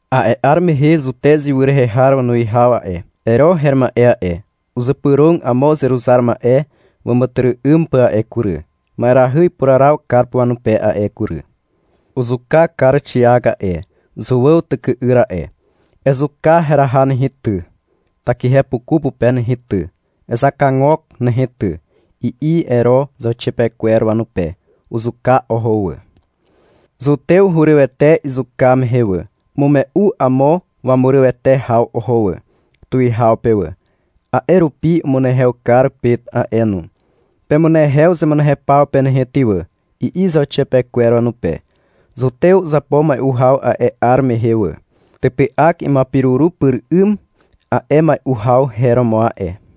A'e 'ar mehe Zutez ywy rehe har wanuwihaw a'e, Ero her ma'e a'e, uzypyrog amo uzeruzar ma'e wàmàtyry'ym pà a'e kury, ma'erahy ipuraraw kar pà wanupe a'e kury. Uzuka kar Xiak a'e, Zuàw tyky'yr a'e. — Ezuka heraha nehe, ty, takihepuku pupe nehe ty. Ezakagok nehe ty, i'i Ero zauxiapekwer wanupe. Uzuka oho wà. Zutew hurywete izuka mehe wà. Umume'u amo wanurywete haw oho wà, tuwihaw pe wà. A'e rupi umunehew kar Pet a'e no. — Pemunehew zemunehew paw pe nehe ty wà, i'i zauxiapekwer wanupe. Zutew uzapo mai'u haw a'e 'ar mehe wà. Typy'ak imuapiruru pyr 'ym a'e mai'u haw her romo a'e.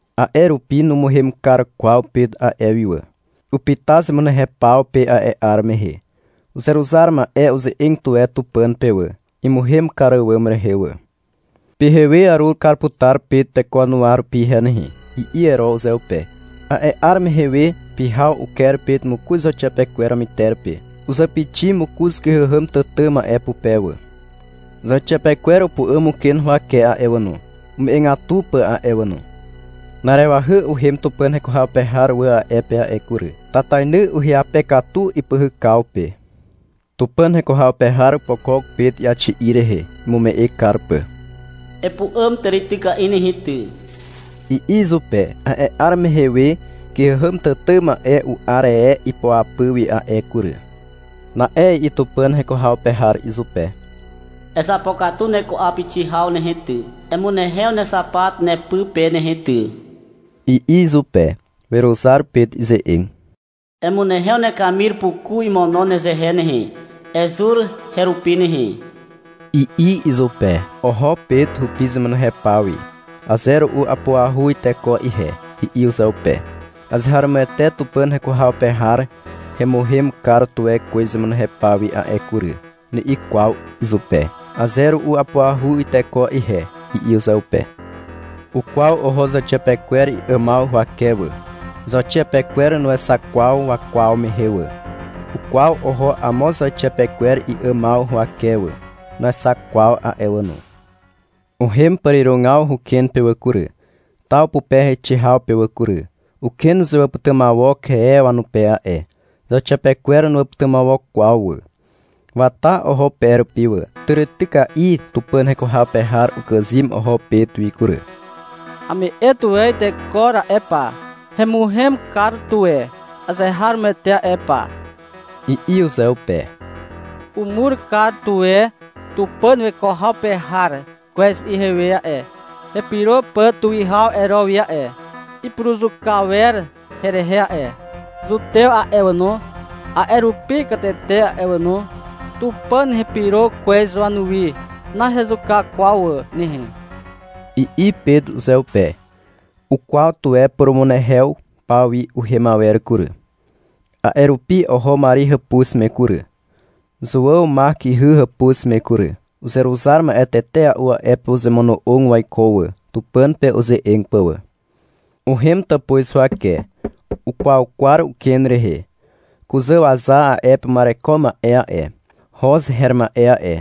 A'e rupi numuhem kar kwaw Pet a'e wi wà. Upyta zemunehew paw pe a'e 'ar mehe. Uzeruzar ma'e uze'eg tuwe Tupàn pe wà, imuhem kar àwàm rehe wà. — Pyhewe arur kar putar Pet teko wanuwa rupi ihe nehe, i'i Ero uzeupe. A'e 'ar mehe we, pyhaw, uker Pet mokoz zauxiapekwer wamyter pe. Uzàpixi mokoz kyhàhàm tàtà ma'e pupe wà. Zauxiapekwer upu'àm uken huwake a'e wà no, ume'egatu pà a'e wà no. Na'arewahy uhem Tupàn heko haw pe har wà a'e pe a'e kury. Tatainy uhyape katu ipyhykaw pe. Tupàn heko haw pe har opokok Pet iaxi'i rehe, imume'e kar pà. — Epu'àm tàrityka'i nehe ty, i'i izupe. A'e 'ar mehe we kyhàhàm tàtà ma'e u'ar e ipoapy wi a'e kury. Na'e i'i Tupàn heko haw pe har izupe. Ezapokatu neku'awpixi haw nehe ty, emunehew nexapat nepy pe nehe ty, i'i izupe. Weruzar Pet ize'eg. — Emunehew nekamir puku imono nezehe nehe, ezur herupi nehe, i'i izupe. Oho Pet hupi zemunehew paw wi. — Aze ru'u apuahu iteko ihe, i'i uzeupe. — Azeharomoete Tupàn heko haw pe har hemuhem kar tuwe kwez zemunehew paw wi a'e kury, ni'i kwaw izupe. — Aze ru'u apuahu iteko ihe, i'i uzeupe. Ukwaw oho zauxiapekwer i'àmaw huwake wà. (Zauxiapekwer nuexak kwaw wakwaw mehe wà.) Ukwaw oho amo zauxiapekwer i'àmaw huwake wà. (Nuexak kwaw a'e wà no.) Uhem pàrirogaw huken pe wà kury, taw pupe heixe haw pe wà kury. Uken uzewàpytymawok e wanupe a'e. (Zauxiapekwer nuwàpytymawok kwaw wà.) Wata oho pe rupi wà. Tàrityka'i Tupàn heko haw pe har ukàzym oho Pet wi kury. — Ame'e tuwe iteko ra'e pa, hemuhem kar tuwe azeharomoete a'e pa, i'i uzeupe. — Umur kar tuwe Tupàn weko haw pe har kwez ihewe a'e, hepyro pà tuwihaw Ero wi a'e. Ipuruzuka wer herehe a'e. Zutew a'e wà no, a'e rupi katete a'e wà no. Tupàn hepyro kwez wanuwi. Nahezuka kwaw wà nehe, i'i Pet uzeupe. Ukwaw tuwe purumunehew paw wi uhem awer kury. A'e rupi oho Mari hàpuz me kury, Zuàw Mak ihy hàpuz me kury. Uzeruzar ma'e tetea'u a'e pe uzemono'og waiko wà, Tupàn pe uze'eg pà wà. Uhem tàpuz huwake. Ukwaukwar uken rehe. Kuzàwaza a'e pe uma'ereko ma'e a'e, Hoz her ma'e a'e,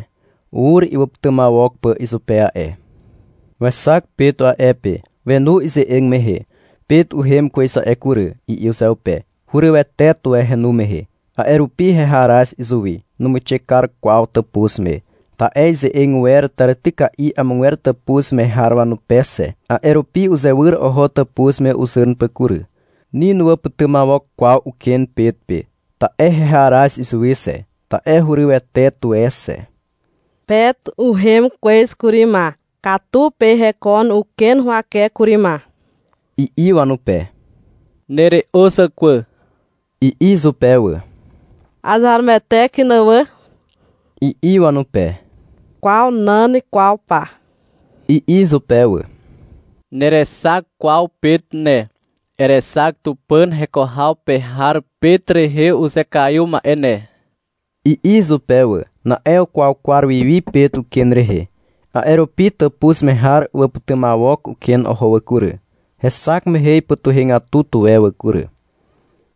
ur iwàpytymawok pà izupe a'e. Wexak Pet a'e pe. Wenu ize'eg mehe. — Pet uhem kwez a'e kury, i'i uzeupe. Hurywete tuwe henu mehe. A'e rupi heharaz izuwi. Numuixe kar kwaw tàpuz me, ta'e ize'eg wer tàrityka'i amogwer tàpuz me har wanupe xe. A'e rupi uzewyr oho tàpuz me uzàn pà kury. Ni nuwàpytymawok kwaw uken Pet pe. Ta'e heharaz izuwi xe, ta'e hurywete tuwe xe. — Pet uhem kwez kury ma. Katu pe hekon uken huwake kury ma, i'i wanupe. — Nere'o zàkwà, i'i izupe wà. — Azeharomoete kyn wà, i'i wanupe. — Kwa nan kwaw pa, i'i izupe wà. — Nerexak kwaw Pet ne. Erexak Tupàn heko haw pe har Pet rehe uzekaiw ma'e ne, i'i izupe wà. Na'e ukwaukwar wi wi Pet uken rehe. A'e rupi tàpuz me har uwàpytymawok uken oho wà kury. Hexak mehe ipytuhegatu tuwe wà kury.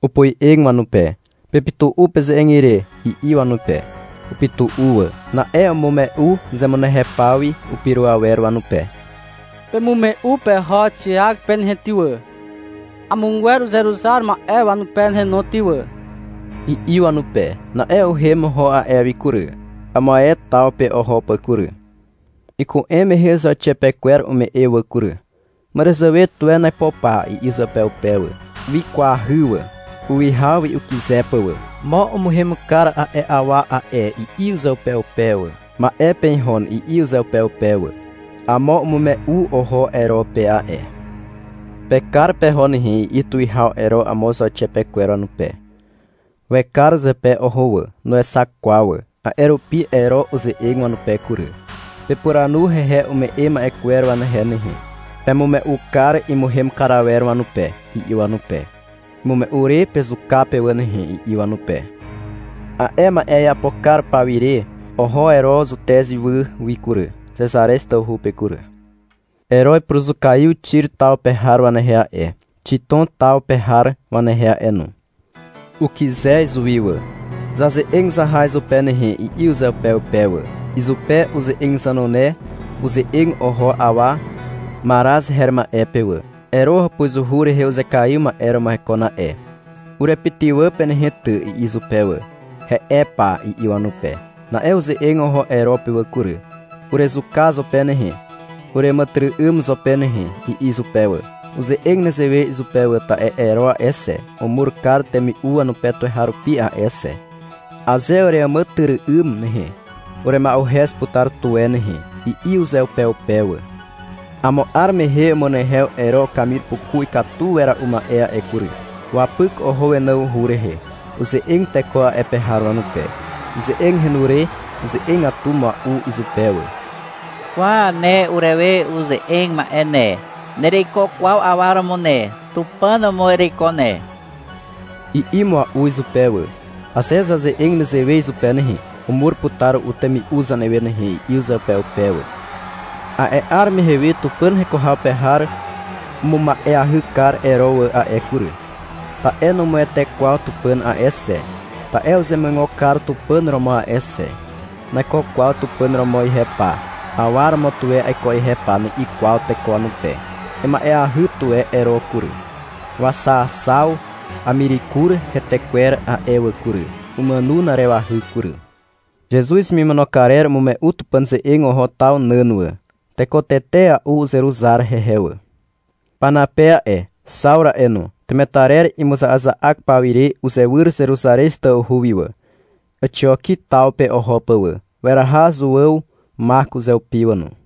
Opoe'eg wanupe, — Pepytu'u peze'eg ire, i'i wanupe. Upytu'u wà. Na'e umume'u zemunehew paw wi upyro awer wanupe. — Pemume'u peho Xiak pe nehe ty wà, amogwer uzeruzar ma'e wanupe nehe no ty wà, i'i wanupe. Na'e uhem oho a'e wi kury, amo ae taw pe oho pà kury. Iku'em mehe zauxiapekwer ume'e wà kury. — Màràzàwe tuwen aipo pa, i'i uzeupeupe wà. Wikwahy wà, uwihaw wi ukyze pà wà. — Mo umuhem kar a'e awa a'e, i'i uzeupeupe wà. — Ma'e pe ihon, i'i uzeupeupe wà. (Amo umume'u oho Ero pe a'e.) — Pekar peho nehe, i'i tuwihaw Ero amo zauxiapekwer wanupe. Wekar zepe oho wà. Nuexak kwaw wà. A'e rupi Ero uze'eg wanupe kury. — Pepuranu hehe ume'e ma'e kwer wanehe nehe. Pemume'u kar imuhem kar awer wanupe, i'i wanupe. — Imume'u re pezuka pe wà nehe, i'i wanupe. A'e ma'e iapo kar pawire oho Ero Zutez ywy wi kury, Xezarez tawhu pe kury. Ero ipuruzukaiw Xir taw pe har wanehe a'e, Xitom taw pe har wanehe a'e no. Ukyze izuwi wà. — Zaze'eg zaha izupe nehe, i'i uzeupeupe wà. Izupe uze'eg zanune uze'eg oho awa Maraz her ma'e pe wà. Ero hàpuzuhu rehe uzekaiw ma'e romo hekon a'e. — Urepytywà pe nehe ty, i'i izupe wà. — He'e pa, i'i wanupe. Na'e uze'eg oho Ero pe wà kury. — Urezuka zo pe nehe, ureàmàtyry'ym zo pe nehe, i'i izupe wà. Uze'eg nezewe izupe wà, ta'e Ero a'e xe, umur kar temi'u wanupe tuweharupi a'e xe. — Aze ureàmàtyry'ym nehe, urema'uhez putar tuwe nehe, i'i uzeupeupe wà. Amo 'ar mehe umunehew Ero ukamir puku ikatu wera'u ma'e a'e kury. Wapyk oho wenawhu rehe. Uze'eg teko a'e pe har wanupe. Ize'eg henu re uze'egatu mua'ua'u izupe wà. — Kwa, ne urewe uze'eg ma'e ne, nereiko kwaw awa romo ne. Tupàn romo ereiko ne, i'i mua'u izupe wà. (-Aze zaze'eg nezewe izupe nehe, umur putar ru'u temi'u zanewe nehe, i'i uzeupeupe wà.) A'e 'ar mehe we Tupàn heko haw pe har umuma'eahy kar Ero wà a'e kury, ta'e numuwete kwaw Tupàn a'e xe, ta'e uzemuigo kar Tupàn romo a'e xe. — Naiko kwaw Tupàn romo ihe pa, awa romo tuwe aiko ihe pa, ni'i kwaw teko wanupe. Ima'eahy tuwe Ero kury. Waxaaxaw amirikur hetekwer a'e wà kury. Umàno na'arewahy kury. Zezuz hemimono karer umume'u Tupàn ze'eg oho taw nàn wà. Teko tetea'u uzeruzar hehe wà. Panape a'e, Xawru a'e no, temetarer imuza'aza'ak pawire uzewyr Zeruzarez tawhu wi wà, Àxioki taw pe oho pà wà. Weraha Zuàw Mak uzeupi wà no.